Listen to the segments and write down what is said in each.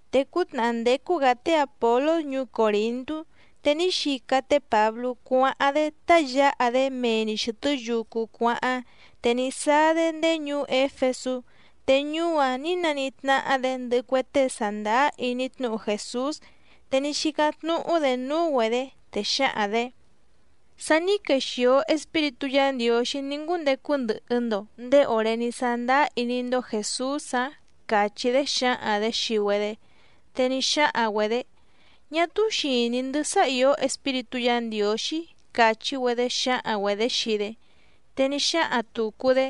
Te cútnàhá ndécú‑gǎ té Àpolós ñuú Còrintú, te ní xica té Pǎblú cuáháⁿ‑dé tá yǎha‑dé mee‑ni xɨ̀tɨ́ yucu cuáháⁿ, te ní sáá‑dé ndéé ñuú Éfesú. Te ñuú‑áⁿ nǐ naníhí tnáhá‑dě ndɨhɨ cue tée sàndáá iní tnúhu Jèsús. Te ní xícáⁿ tnúhú‑dě núú‑güedě, te xǎhaⁿ‑dě: —¿Sa ní quexìo Espíritú Yǎ Ndiǒxí ní ngúndecu ndɨhɨ‑ndo nděé òré ní sándáá iní‑ndó Jèsús‑ǎⁿ? —càchí‑dé xǎhaⁿ‑dě xii‑güedé. Te ní xáhaⁿ‑güedě: —Ñá túú xìní‑ndɨ́ sá ìó Espíritú Yǎ Ndiǒxí —càchí‑güedé xǎhaⁿ‑güedě xii‑dé. Te ní xáhaⁿ tùcu‑dé: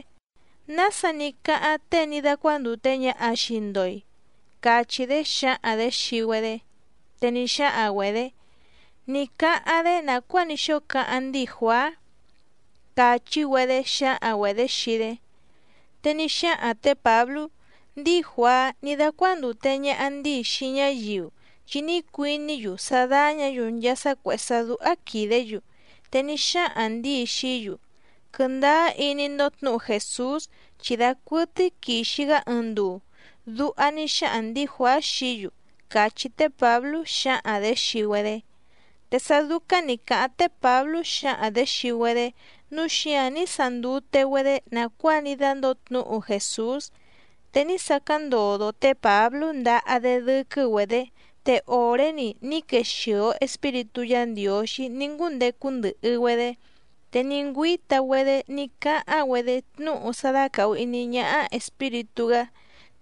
—¿Nása ní cáháⁿ tée ní dácuándùte ñaha xii‑ndo‑i? —cachí‑dé xǎhaⁿ‑dě xii‑güedé. Te ní xáhaⁿ‑güedě: —Ní cáháⁿ‑dé nàcuáa ní xóo cáháⁿ ndíi Juàá —càchí‑güedé xǎhaⁿ‑güedě xii‑dé. Te ní xáhaⁿ tě Pǎblú: —Ndíi Juàá ní dácuándùte ñaha ndíi xii ñáyiu, chi ní cuiní‑yu sá dáñǎ‑yu nchaa sá cuèhé sá dúhá quìdé‑yu. Te ní xáhaⁿ ndǐi xií‑yu: “Quɨndáá iní‑ndó tnǔhu Jèsús chi dacuɨtɨ́í quìxi‑gá ɨɨⁿ nduu”, duha ní xáhaⁿ ndǐi Juàá xií‑yu —càchí té Pǎblú xǎhaⁿ‑dě xii‑güedé. Te sá dúcáⁿ nǐ cáháⁿ té Pǎblú xǎhaⁿ‑dě xii‑güedé, núu xíǎⁿ ní sandute‑güedé nàcuáa ní dándǒo tnúhu Jèsús. Te ní sacáⁿ ndodo té Pǎblú ndahá‑dé dɨ́quɨ́‑güedě, te òré‑ni ní quexìo Espíritú Yǎ Ndiǒxí ní ngúndecu ndɨhɨ‑güedé, te ní ngüíta‑güedé ní cáháⁿ‑güedé tnúhu sá dácàhu iní ñáhá Espíritú‑gá,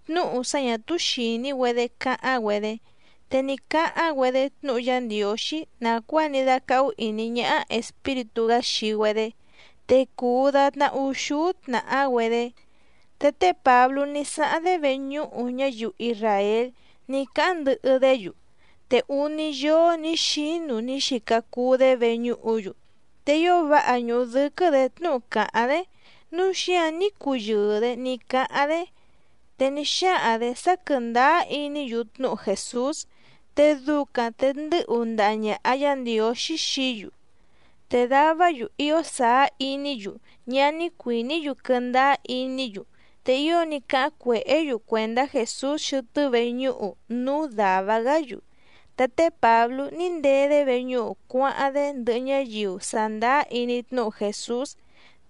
tnúhu sá ñà túú xìní‑güedé cáháⁿ‑güedé, te ní cáháⁿ‑güedé tnúhu Yá Ndiǒxí nàcuáa ní dácáhú ìní ñáhá Espíritú‑gá xii‑güedé. Te cùu datná úxúú tnàhá‑güedé. Te té Pǎblú ní sáháⁿ‑dé veñúhu ñáyiu isràél ní cáháⁿ ndɨhɨ‑dé‑yu, te úní yóó nǐ xínu ní xica cuu‑dé veñúhu‑yu. Te ío váha ñùhu dɨ́quɨ́‑dě tnúhu cáháⁿ‑dé, núu xíǎⁿ ní cuyɨɨ‑dě ní cáháⁿ‑dé, te ní xáhaⁿ‑dě sá quɨ̀ndáá iní‑yu tnúhu Jèsús, te ducaⁿ te ndɨ́hu ndaha ñàha Yá Ndiǒxí xií‑yu. Te davá‑yu ío sàá iní‑yu ñá ní cuìní‑yu quɨndáá iní‑yu, te ío ní cáháⁿ cuèhé‑yu cuèndá Jèsús xɨtɨ́ veñúhu núú dàva‑gá‑yu. Te té Pǎblú ní ndee‑dé veñúhu cuáháⁿ‑dé ndɨhɨ ñáyiu sàndáá iní tnúhu Jèsús.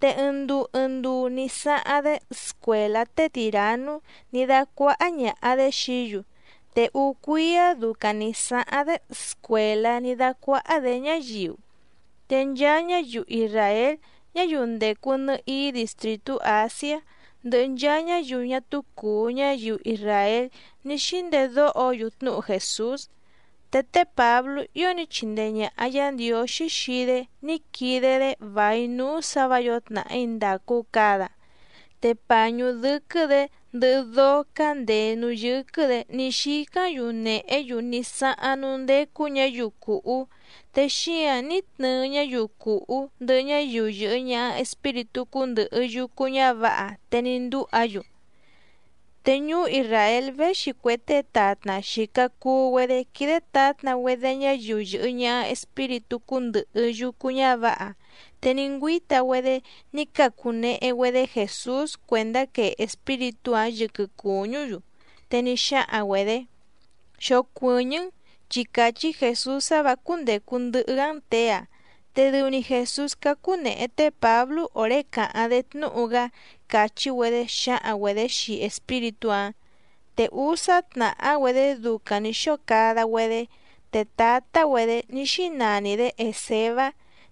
Te ɨɨⁿ nduu ɨɨⁿ nduu ní sáháⁿ‑dé scuèlá té Tìranú ní dácuáhá ñàha‑dé xií‑yu. Te úú cuíá ducaⁿ nǐ sáháⁿ‑dé scuèlá ní dácuáhá‑dě ñáyiu. Te nchaa ñáyiu isràél ñáyiu ndècu nɨhií distrìtú Àsiá ndɨhɨ nchaa ñáyiu ñá túú cùu ñáyiu isràél ní xíndedóho‑yu tnúhu Jèsús. Te té Pǎblú ío ní chindee ñàha Yá Ndiǒxí xii‑dé ní quide‑dé vài núú sǎ vǎ yǒo tnàhí ndàcu cada. Te pàñú dɨ́quɨ́‑dě ndɨhɨ dóó cándèé núú yɨ́quɨ́‑dě ní xícáⁿ‑yu nèhé‑yu ní sáháⁿ núú ndécú ñǎyiu cùhú, te xíǎⁿ ní tnɨɨ ñáyiu cùhú ndɨhɨ ñáyiu yɨ̀hɨ ñaha espíritú cúndɨ̀hɨ yucu ñávǎha, te ní ndúha‑yu. Te ñuú Isràél véxi cue tée tatna xìca cuu‑güedé quídé tǎtna‑güedé ñáyiu yɨ̀hɨ ñaha espíritú cúndɨ̀hɨ yucu ñávǎha. Te ní ngüíta‑güedé ní cacu nèhe‑güedé Jèsús cuèndá quee espíritú‑áⁿ yɨquɨ cùñú‑yu, te ní xáhaⁿ‑güedě: —Xocuɨ̀ñɨ́‑n, chi càchí Jèsús sá vǎ cúndècu ndɨhɨ‑gá‑n těe‑a. Te dɨu‑ni Jèsús cácú nèhe té Pǎblú òré càháⁿ‑dé tnúhu‑gá —càchí‑güedé xǎhaⁿ‑güedě xii espíritú‑áⁿ. Te úsá tnàhá‑güedé ducaⁿ nǐ xóo cada‑güedé. Te tǎtá‑güedě ní xínani‑dě Èsevá,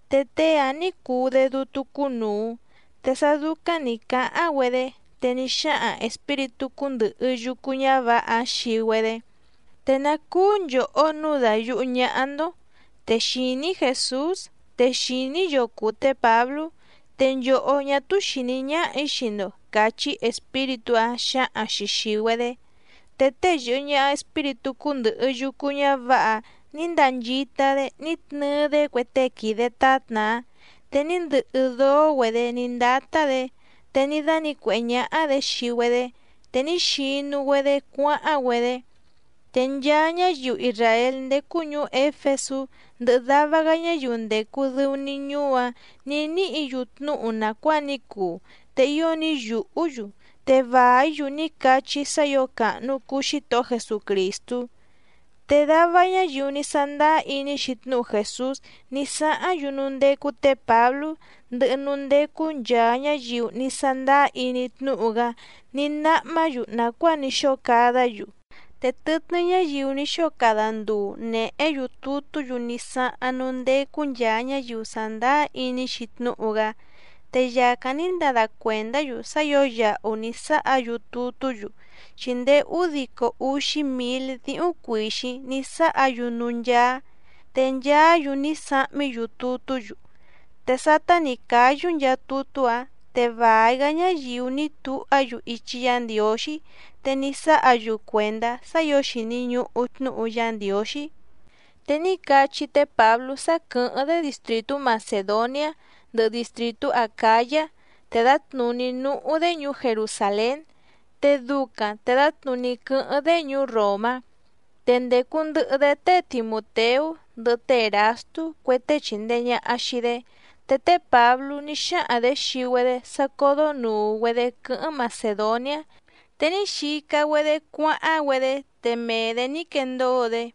te tée‑áⁿ nǐ cuu‑dé dútú cúnùu. Te sá dúcáⁿ nǐ cáháⁿ‑güedé, te ní xáhaⁿ espíritú cúndɨ̀hɨ yucu ñávǎha‑áⁿ xii‑güedé: —¿Te ná cúú nchòhó nǔu dayùhú ñáhá‑ndó? Te xìní‑í Jèsús, te xìní‑í yoo cùu té Pǎblú, te nchòhó ñá túú xìní ñáhà‑í xii‑ndo —càchí espíritú‑áⁿ xǎhaⁿ‑xi xìi‑güedé. Te tée yɨ̀hɨ ñaha espíritú cúndɨ̀hɨ yucu ñávǎha‑áⁿ nǐ ndanchita‑dé ní tnɨɨ‑dé cue tée quìde tátna‑áⁿ, te ní ndɨhɨ dóó‑güedě ní ndátá‑dě, te ní dánǐcuèhé ñáhá‑dě xii‑güedé, te ní xinu‑güedé cuáháⁿ‑güedé. Te nchaa ñáyiu isràél ndécú ñùú Éfesú ndɨhɨ dava‑gá ñáyiu ndècu dɨu‑ni ñuú‑áⁿ nǐ níhǐ‑yu tnúhu nàcuáa ní cuu, te ío ní yùhú‑yu, te vàí‑yu ní cachí sá ǐo càhnu cuu Xítohó Jesucrìstú. Te dava ñáyiu ní sándáá iní‑xi tnúhu Jèsús ní sáháⁿ‑yu núú ndécú tě Pǎblú, ndɨhɨ núú ndécú nchàa ñáyiu ní sándáá iní tnúhu‑gá ní náhmá‑yu nàcuáa ní xóo cadá‑yu. Te tɨtnɨ́ ñáyiu ni xóo cada ndùu nehé‑yu tutú‑yu ní sáháⁿ núú ndécú nchàa ñáyiu sàndáá iní‑xi tnúhu‑gá, te yàcáⁿ ní ndada cuèndá‑yu sá ǐo yahu ní sáha‑yu tutú‑yu, chi ndéé údico úxí mǐl díhúⁿ cuìxíⁿ ní sáha‑yu núú ncháá. Te nchaá‑yu ní sahmí‑yu tutú‑yu. Te sátá nǐ cáyú nchaa tutú‑áⁿ, te vài‑gá ñáyiu ní tuhá‑yu ichi Yá Ndiǒxí, te ní sáha‑yu cuèndá sá ǐo xìni ñuhu tnúhu Yá Ndiǒxí. Te ní cachí té Pǎblú sá quɨ̀hɨ́ⁿ‑dé distrìtú Macèdoniá ndɨhɨ distrìtú Acǎyá, te dǎtnùní núhú‑dé ñuú Jerusàlén, te ducaⁿ te dǎtnùní quɨ́hɨ́ⁿ‑dé ñuú Ròmá. Te ndècu ndɨhɨ‑dé té Timùteú ndɨhɨ té Èrastú cue tée chìndee ñaha xii‑dé. Te té Pǎblú ní xáhaⁿ‑dě xii‑güedé sá códó nùu‑güedé quɨ́hɨ́ⁿ Macèdoniá, te ní xica‑güedé cuáháⁿ‑güedé, te mee‑dě ní quendóo‑dé.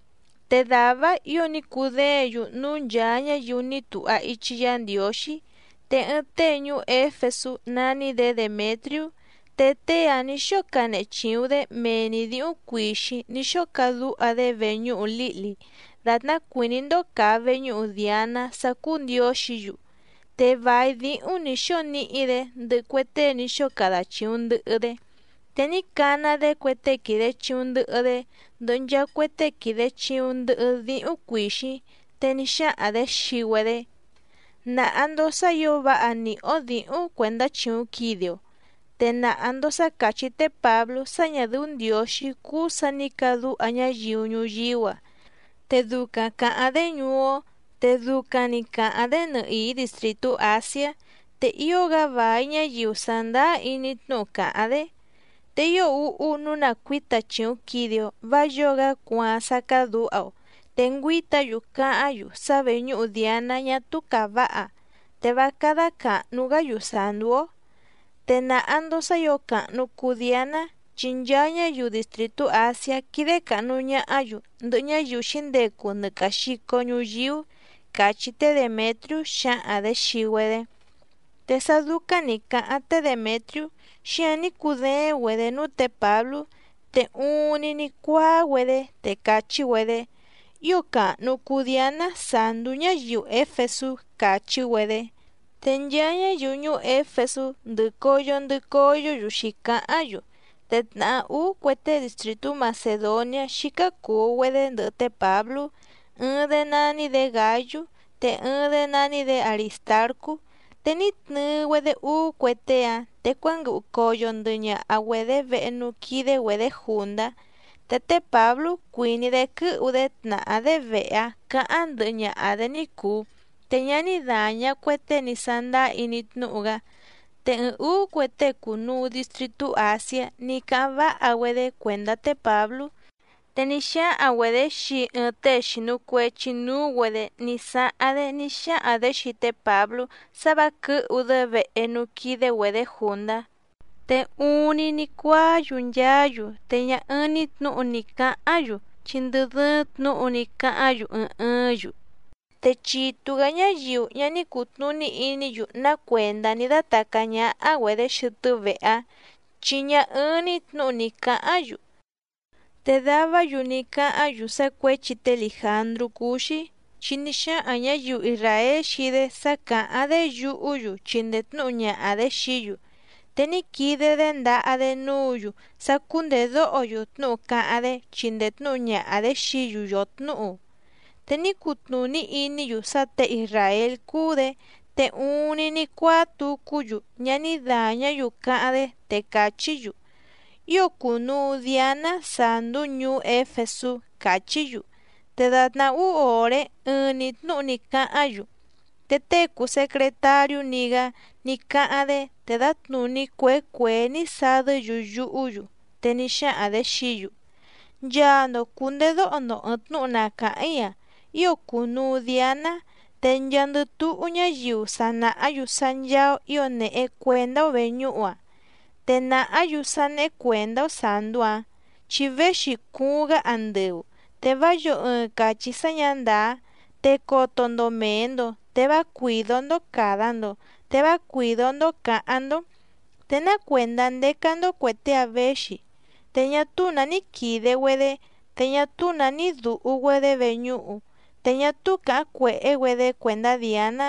Te dàvá‑áⁿ ǐo ní cudéěⁿ‑yu núú nchàa ñáyiu ní tuha ichi Yá Ndiǒxí. Te ɨɨⁿ tée ñuú Éfesú nání‑dě Demètriú. Te tée‑áⁿ nǐ xóo canehe chìuⁿ‑dé mee‑ni dǐhúⁿ cuìxíⁿ ní xóo cadúha‑dé veñúhu lǐhli, dàtná cuìní‑ndó càa veñúhu Diàná sá cúú ndiǒxǐ‑yu. Te vài díhúⁿ nǐ xóo níhí‑dě ndɨhɨ cue tée ní xóo cada chìuⁿ ndɨhɨ‑dé. Te ní cana‑dé cue tée quìde chiuⁿ ndɨhɨ‑dé, ndɨhɨ nchaa cue tée quìde chiuⁿ ndɨhɨ díhúⁿ cuìxíⁿ, te ní xáhaⁿ‑dě xii‑güedé: —Nàha‑ndo sá ǐo váha nìhí‑ó dǐhúⁿ cuèndá chìuⁿ quide‑o. Te nàha‑ndo sá càchí té Pǎblú sá ñà dɨ́ú ndiǒxí cúú sǎ nǐ cadúha ñáyiu ñuyíú‑a. Te ducaⁿ càháⁿ‑dé ñuú‑ó, te ducaⁿ‑ni càháⁿ‑dé nɨhìí distrìtú Àsiá, te ío‑gá vài ñáyiu sàndáá iní tnúhu càháⁿ‑dé. Te ío úhú nǔu na cuǐta chìuⁿ quide‑o, vá yǒo‑gá cuaaⁿ sá cádǔha‑o. Te ngüíta‑yu cáháⁿ‑yu sá veñúhu Diàná ñá túú càváha, te vá cádá càhnu‑gá‑yu sàndú‑ó. Te nàha‑ndo sá ǐo càhnu cuu Dianá, chi nchaa ñáyiu distrìtú Àsiá quídé càhnu ñahá‑yu ndɨhɨ ñáyiu xǐndecu nɨ càa xico ñuyíú —càchí té Demètriú xǎhaⁿ‑dě xii‑güedé. Te sá dúcáⁿ nǐ cáháⁿ té Demètriú, xíǎⁿ ní cudééⁿ‑güedě núú tě Pǎblú, te uuⁿni ní cuáá‑güedé te càchí‑güedé: —¡Ío càhnu cuu Dianá sàndú ñáyiu Éfesú! —càchí‑güedé. Te nchaa ñáyiu ñuú Éfesú ndɨ̀ coyo ndɨ coyó‑yu xǐcáháⁿ‑yu. Te tnàhá úú cue tée distrìtú Macèdoniá xícá cùu‑güedé ndɨhɨ té Pǎblú, ɨɨⁿ‑dé nání‑dě Gǎyú, te ɨɨⁿ‑dé nání‑dě Arìstarcú. Te ní tnɨɨ‑güedé úú cue tée‑áⁿ, te cuánguɨhu coyo ndɨhɨ ñaha‑güedě vehe núú quídé‑güedě jùndá. Te té Pǎblú cuìní‑dé quɨ́hu‑dé tnàhá‑dé vehe‑áⁿ cǎháⁿ ndɨhɨ ñaha‑dě ní cùu, te ñá ní dàña cue tée ní sándáá iní tnúhu‑gá. Te ɨɨⁿ ǔú cue tée cùnuu distritú Àsiá ní cáháⁿ váha‑güedé cuèndá té Pǎblú, te ní xáhaⁿ‑güedě xii ɨɨⁿ tée xìnu cuechi núú‑güedě ní sáháⁿ‑dé ní xáhaⁿ‑dě xii té Pǎblú sá vǎ quɨ̌hu‑dé vehe núú quídé‑güedě jùndá. Te uuⁿni ní cuáá‑yu nchaá‑yu, te ñá ɨ́ɨ́ⁿ‑ní tnǔhu ni cǎháⁿ‑yu, chi ndɨ dɨ́ɨ́ⁿ tnǔhu ní cáháⁿ‑yu ɨɨⁿ ɨɨ́ⁿ‑yu. Te chitu‑gǎ ñáyiu ñá ní cùtnuní iní‑yu ná cuèndá ní dátàcá ñáhá‑güedě xɨtɨ́ vehe‑áⁿ, chi ñá ɨ́ɨ́ⁿ‑ní tnǔhu ni cǎháⁿ‑yu. Te davá‑yu ní cáháⁿ‑yu sá cuěchi té Lìjandrú cúú‑xí, chi ní xáhaⁿ ñǎyiu isràél xii‑dé sá càháⁿ‑dé yuhú‑yu chindee tnǔhu ñaha‑dě xií‑yu. Te ní quide‑dé ndaha‑dé núǔ‑yu sá cúndèdóho‑yu tnúhu cáháⁿ‑dé chindee tnúhu ñaha‑dě xií‑yu yòtnúhu. Te ní cutnùní iní‑yu sá těe isràél cúú‑dě, te uuⁿni ní cuáá tucú‑yu, ñá ní dàñá‑yu cáháⁿ‑dé, te càchí‑yu: —¡Ío cùnuu Dianá sàndú ñuú Éfesú! —càchí‑yu. Te dàtná úú òré ɨɨⁿ‑ni tnǔhu ní cáháⁿ‑yu. Te tée cùu secretariú‑ni‑gá ní cáháⁿ‑dé, te dǎtnùní cuèé cuèé ní sadɨ́‑yu yuhú‑yu. Te ní xáhaⁿ‑dě xií‑yu: —Nchaa‑ndo cùndedóho‑ndo ɨ̀ɨⁿ tnúhu na càháⁿ‑í‑a. Ío cùnuu Dianá, te nchaandɨ túhú ñáyiu sa nàhá‑yu sá ncháá‑ó ǐo nèhe cuendá‑ó vèñúhu‑ǎⁿ. Te nàhá‑yu sá néhé cuèndá‑ó sàndú‑áⁿ, chi véxi cuuⁿ‑gá andɨu. Te vá yǒo ɨɨⁿ càchí sá ñǎ ndàá. Te coto‑ndo mèe‑ndo, te vá cuìdó‑ndó càda‑ndo, te vá cuìdó‑ndó cǎháⁿ‑ndó. Te ná cuèndá ndécá‑ndó cuè tée‑áⁿ věxi, te ñá túú nǎ ní quìde‑güedé, te ñá túú nǎ ní dùhu‑güedé veñúhu, te ñá túú càháⁿ cuèhé‑güedé cuèndá Diàná.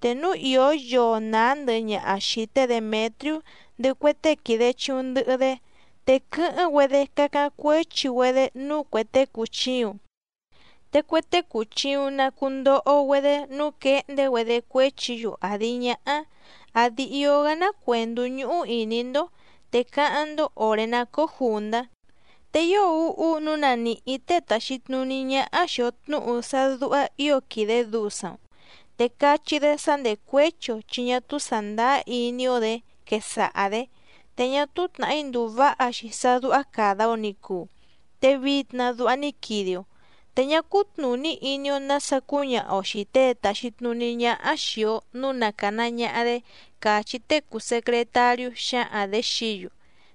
Te núu ìó yoo nàá ndɨhɨ ñaha xìi té Demètriú ndɨhɨ cue tée quìde chiuⁿ ndɨhɨ‑dé, te quɨ́hɨ́ⁿ‑güedé cacáⁿ cuéchi‑güedé núú cuè tée cùchiuⁿ. Te cue tée cùchiuⁿ na cundoho‑güedé nǔu quehndé‑güedé cuéchi‑yu àdi ñáhá. Àdi ío‑gá ná cuèndú ñúhú ìní‑ndó, te cáháⁿ‑ndó òré ná cóó jùndá. Te ío úhú nǔu na nìhí tée tàxi tnuní ñáhá xìi‑o tnúhu sá dúhá ǐo quìde dusaⁿ‑o, te cachí‑dé sá ndècuéchi‑o chi ñá túú sàndáá iní‑ó‑dě quesaha‑dě. Te ñá túú tnàhí ndùu váha‑xi sá dúhá càda‑o ni cuu, te vitna duha ní quide‑o, te ñá cútnùní iní‑ó nǎsa cúñaha‑o xìi tée tàxi tnuní ñáhá xìi‑o núu na càna ñaha‑dé —càchí tée cùu secretariú xǎhaⁿ‑dě xií‑yu.